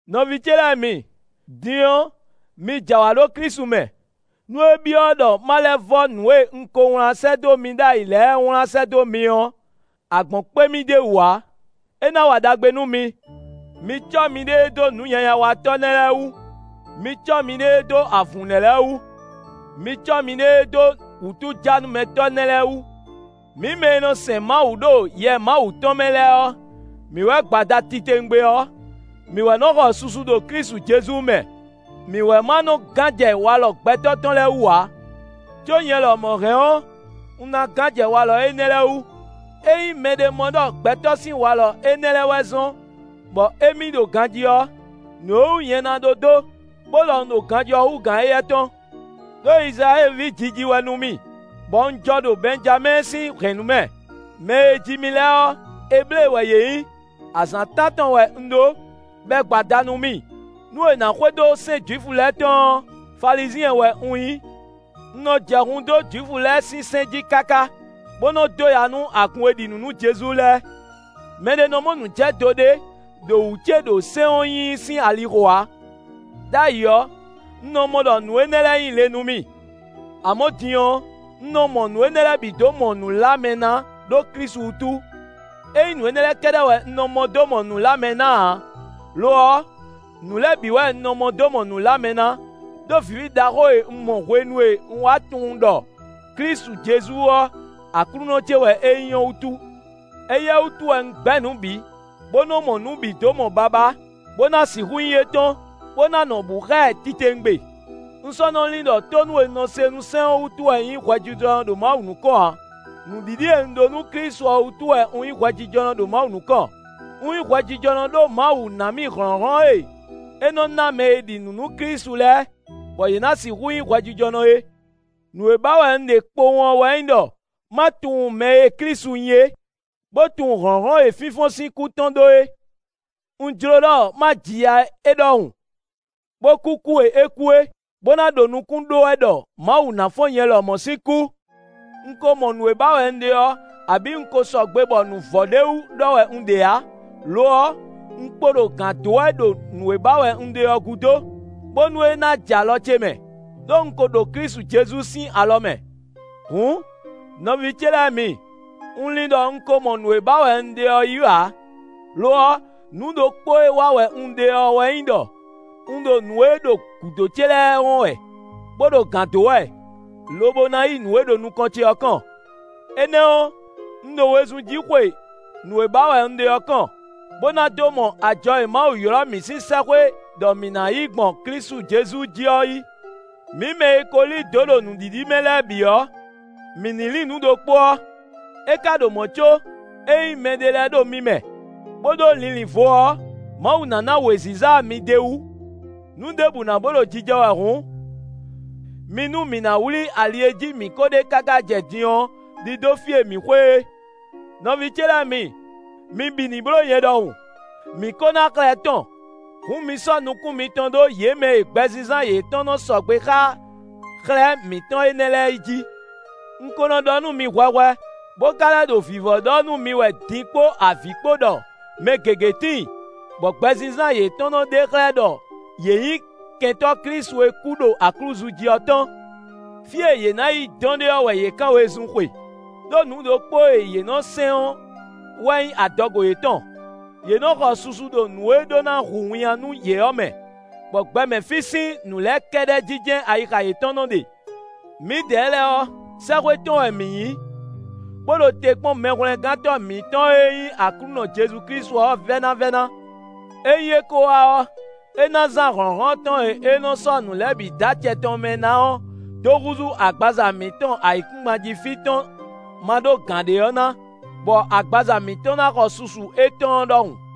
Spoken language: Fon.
Nɔví ce lɛ́ɛ mi, din ɔ́, mi jɛ awǎ ɖo Klísu mɛ, nú é byɔ́ ɖɔ má lɛ́ vɔ́ nǔ e un ko wlán sɛ́ dó mi ɖ'ayǐ lɛ́ɛ wlán sɛ́ dó mi ɔ́, agbɔ̌n kpé mì d'é wú ǎ; é ná wa ɖagbe nú mi. Mi cɔ́ miɖée dó nǔnyanyawatɔ́ nɛ́ lɛ́ɛ wú; mi cɔ́ miɖée dó avǔn nɛ́ lɛ́ɛ wú; mi cɔ́ miɖée dó wútujánúmɛtɔ́ nɛ́ lɛ́ɛ wú. Mǐ mɛ e nɔ sɛn Mawu ɖo Yɛ Mawu tɔn mɛ lɛ́ɛ ɔ́, mǐ wɛ gbo ada titewungbe ɔ́; mǐ wɛ nɔ xɔ susu ɖo Klísu Jezu mɛ; mǐ wɛ ma nɔ gán jɛ walɔ gbɛtɔ́ tɔn lɛ́ɛ wú ǎ. Có nyɛ lɔmɔ̌ hɛn ɔ́, un ná gán jɛ walɔ énɛ́ lɛ́ɛ wú. Ényí mɛɖé mɔ ɖɔ gbɛtɔ́ sín walɔ énɛ́ lɛ́ɛ wɛ zɔ́n bɔ émí ɖo ganjí ɔ́, nǔ e wú nyɛ ná ɖó dó, bó ɖɔ un ɖo ganjí ɔ́ hú gǎn éyɛ́ tɔn. Đó Izlayɛ́li ví jiji wɛ nú mì, bɔ un jɔ ɖo Bɛnjamɛ́ɛ sín hɛ̌nnu mɛ. Mɛ e ji mì lɛ́ɛ ɔ́, Eblée wɛ yě nyí. Azǎn tántɔn wɛ un ɖó, bɔ è gbo ada nú mì. Nú è nǎ xwedó sɛ́n Jwifu lɛ́ɛ tɔn ɔ́, Falizyɛn wɛ un nyí. Un nɔ jɛ hun dó Jwifu lɛ́ɛ sín sɛ́n jí káká, bó nɔ dó ya nú agun e ɖi nǔ nú Jezu lɛ́ɛ. Mɛ ɖé nɔ mɔ nǔjɛdo ɖé ɖo wǔ ce ɖo sɛ́n ɔ́ nyinyi sín ali xo ǎ. Đ'ayǐ ɔ́, un nɔ mɔ ɖɔ nǔ énɛ́ lɛ́ɛ nyí le nú mì; amɔ̌ din ɔ́, un nɔ mɔ nǔ énɛ́ lɛ́ɛ bǐ dó mɔ nǔ lá mɛ ná ɖó Klísu wútu. É nyí nǔ énɛ́ lɛ́ɛ kɛ́ɖɛ́ wɛ un mɔ dó mɔ nǔ lá mɛ ná ǎ; lo ɔ́, nǔ lɛ́ɛ bǐ wɛ un mɔ dó mɔ nǔ lá mɛ ná, ɖó vǐví ɖaxó e un mɔ hwenu e un wá tunwun ɖɔ Klísu Jezu ɔ́, Aklúnɔ ce wɛ é nyí ɔ́ wútu; éyɛ́ wútu wɛ un gbɛ́ nǔ bǐ, bó nɔ́ mɔ nǔ bǐ dó mɔ babá, bó ná sixú nyí étɔn, bó ná nɔ bǔ xá ɛ titewungbe; un sɔ́ nɔ́ lin ɖɔ tónú e un nɔ se nú sɛ́n ɔ́ wútu wɛ un nyí hwɛjijɔnɔ ɖo Mawu nukɔn ǎ; nǔɖiɖi e un ɖó nú Klísu ɔ́ wútu wɛ un nyí hwɛjijɔnɔ ɖo Mawu nukɔn. Un nyí hwɛjijɔnɔ ɖó Mawu ná mì hlɔ̌nhlɔ́n e é nɔ ná mɛ e ɖi nǔ nú Klísu lɛ́ɛ, bɔ yě ná sixú nyí hwɛjijɔnɔ é. Nǔ e ba wɛ un ɖe kpowun ɔ́ wɛ nyí ɖɔ ma tunwun mɛ e Klísu nyí é, bó tunwun hlɔ̌nhlɔ́n e fínfɔ́n sín kú tɔn ɖó é; un jló ɖɔ ma ji ya é ɖɔhun, bó kú kú e é kú é, bó ná ɖo nukún ɖó wɛ ɖɔ Mawu ná fɔ́n nyɛ lɔmɔ̌ sín kú. Un ko mɔ nǔ e ba wɛ un ɖe ɔ́, abǐ un ko sɔgbe bɔ nǔ vɔ ɖ'é wú ɖɔ wɛ un ɖe ǎ; lo ɔ́, un kpo ɖo gǎn dó wɛ ɖo nǔ e ba wɛ un ɖe ɔ́ gúdo, bónú é ná jɛ alɔ ce mɛ; ɖó un ko ɖo Klísu Jezu sín alɔ mɛ. Hǔn, nɔví ce lɛ́ɛ mi, un lin ɖɔ un ko mɔ nǔ e ba wɛ un ɖe ɔ́ yí ǎ; lo ɔ́, nǔ ɖokpó e wa wɛ un ɖe ɔ́ wɛ nyí ɖɔ un ɖo nǔ e ɖo gǔdo ce lɛ́ɛ wɔn wɛ, bó ɖo gǎn dó wɛ, lobo ná yi nǔ e ɖo nukɔn ce ɔ́ kɔn. Énɛ́ ɔ́, un ɖo wezun jí xwe nǔ e ba wɛ un ɖe ɔ́ kɔn, bó ná dó mɔ ajɔ e Mawu ylɔ́ mǐ sín sɛ́xwé ɖɔ mǐ ná yí gbɔn Klísu Jezu jí ɔ́ yí. Mǐ mɛ e ko lí dǒ ɖo nǔɖiɖi mɛ lɛ́ɛ bǐ ɔ́, mǐ ní lin nǔ ɖokpó ɔ́. É ka ɖo mɔ̌ có, ényí mɛɖé lɛ́ɛ ɖo mi mɛ, bó ɖó linlin vo ɔ́, Mawu ná ná wěziza mi d'é wú. Nǔ ɖěbǔ ná bó ɖo jijɛ wɛ hǔn, mi nú mǐ nǎ wlí ali e jí mǐ kó ɖe káká jɛ din ɔ́ ɖidó fí e mǐ xwe é. Nɔví ce lɛ́ɛ mi, mi bǐ ní bló nyɛ ɖɔhun. Mǐ ko ná xlɛ́ tɔn: hǔn mi sɔ́ nukún mitɔn ɖó yě mɛ e gbɛzínzán yětɔn nɔ sɔgbe xá xlɛ́ mǐtɔn énɛ́ lɛ́ɛ é jí. Un ko nɔ ɖɔ nú mi hwɛhwɛ, bó ka lɛ́ ɖo vǐvɔ́ ɖɔ nú mi wɛ din kpó avǐ kpó ɖɔ mɛ gěgé tíin, bɔ gbɛzínzán yětɔn nɔ ɖe xlɛ́ ɖɔ yě nyí kɛntɔ́ Klísu e kú ɖo aklúzu jí ɔ́ tɔn. Fí e yě ná yi dɔn ɖe ɔ́ wɛ yě kán wezun xwe; ɖó nǔ ɖokpó e yě nɔ sɛn ɔ́ wɛ nyí adɔgo yětɔn; yě nɔ xɔ susu ɖo nǔ e ɖó ná hu winnyá nú yě ɔ́ mɛ, bɔ gbɛ mɛ fí sín nǔ lɛ́ɛ kɛ́ɖɛ́ jí jɛ́n ayixa yětɔn nɔ ɖe. Mǐdɛɛ lɛ́ɛ ɔ́, sɛ́xwé tɔn wɛ mǐ nyí, bó ɖo te kpɔ́n Mɛhwlɛ́ngántɔ́ mǐtɔn e nyí Aklúnɔ Jezu Klísu ɔ́ vɛ́návɛ́ná. Ényí é ko wá ɔ́, é ná zán hlɔ̌nhlɔ́n tɔn e é nɔ dó sɔ́ nǔ lɛ́ɛ bǐ dó acɛ tɔn mɛ ná ɔ́, dó húzú agbaza mǐtɔn ayǐkúngban jí fí tɔn maɖógǎnɖé ɔ́ ná, bɔ agbaza mǐtɔn ná xɔ susu étɔn ɔ́ ɖɔhun.